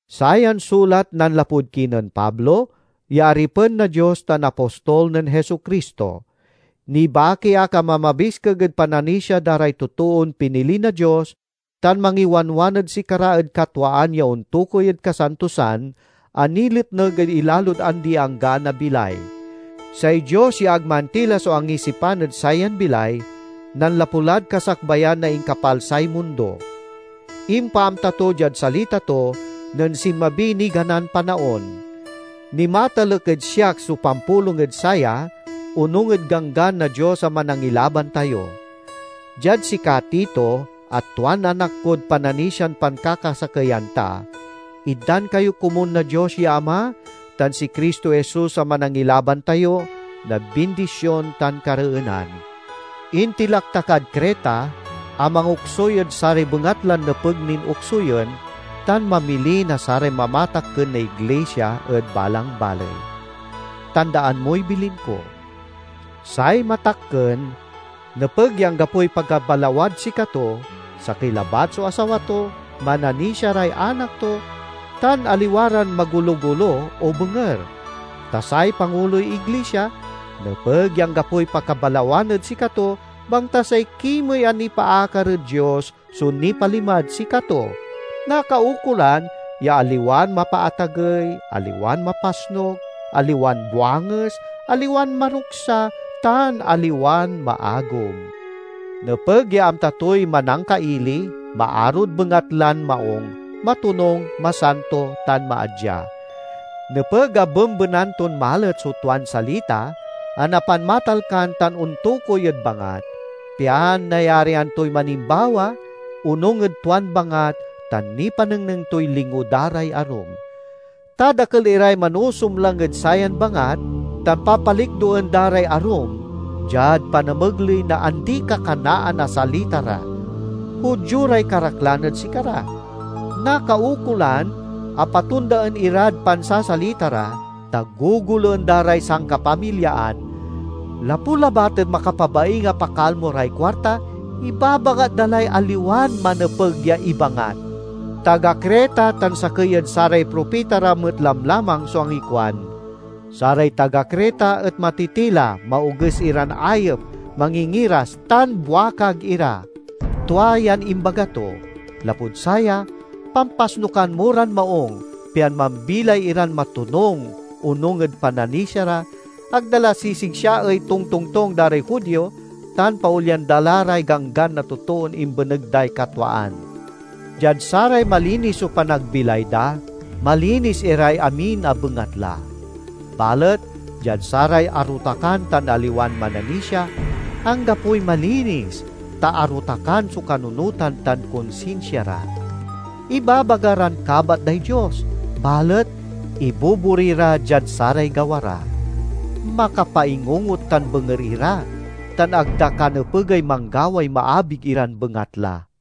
Sayan sulat nanlapud kinen Pablo ya aripen na Dios tan apostol nen Jesu-Cristo. Nibaki ak a mamabiskeg ed pananisia da ray totoon pinili na Dios tan mangiwanwan ed sikara ed katwaan ya ontokuy ed kasantosan, a niletneg ed ilalod andi-anggaan a bilay. Say Dios ya ag mantila so angisipan ed sayan bilay, nanlapu lad kasakbayan na inkapalsay mundo. Impaamta to diad salita to nen sinmabiy niganan panaon. Nimatalek ed siak so pampulong ed saya onung ed ganggan na Dios a Manangilaban tayo. Diad sika Tito a tuan anak kod pananisian pankakasakeyan ta: Itdan kayo komun na Dios ya Ama tan si Cristo Jesus a Manangilaban tayo na bindision tan kareenan. Intilak ta kad Creta a mangoksuy ed saray bengatlan nepeg nin oksuyen, tan mamili na saray mamatakken na iglisia ed balang baley. Tandaan moy bilin ko: say matakken nepeg ya anggapoy pakabalawad sikato, sakey labat so asawa to, mananisia ray anak to, tan aliwa ran magolo-golo o benger. Ta say panguloy iglisia nepeg ya anggapoy pakabalawan ed sikato, bangta say kimey a nipaakar ed Dios so nipalimad sikato. Nakaukolan ya aliwan mapaatagey, aliwan mapasnuk, aliwan buanges, aliwan maruksa, tan aliwan maagom. Nepeg ya amta toy manangkaili, maarod bengatlan maung, matonung, masanto, tan maadya. Nepeg a bembenan ton malet so tuan salita a napanmatalkan tan ontokuy ed bangat, pian nayarian toy manimbawa onung ed tuan bangat, tan nipanengneng toy lingo da ray arum. Ta dakel iray manusumlang ed sayan bangat tan papalikdoen da ray arum, diad panamegley na andi-kakanaan a salita ra. Judio ray karaklan ed sikara. Nakaukolan a patondaen irad pansasalita ra, ta gogoloen da ray sankapamilyaan. Lapu labat ed makapabaing a pakalmo ray kuarta, ibabangat da lay aliwan manepeg ya ibangat. Taga Creta tan sakey ed saray propita ra met lamlamang so angikuan, "Saray taga Creta et matitila, maoges iran ayep, mangingiras, tan buakag ira." Tua yan imbaga to. Lapud saya, pampasnukan mo ran maung, pian mambilay iran matonung onung ed pananisia ra, ag da la sisigsiaey tongtongtong da ray Judio, tan paolyan da la ray ganggan na totoon imbeneg day katwaan. Diad saray malinis so panagbilay da, malinis iray amin a bengatla; balet diad saray arotakan tan aliwan mananisia, anggapoy malinis ta arotakan so kanunotan tan konsinsia ra. Ibabaga ran kabat day Dios, balet ibobori ra diad saray gawa ra. Makapaingungot tan benger ira, tan ag da kanepegay manggaway maabig iran bengatla.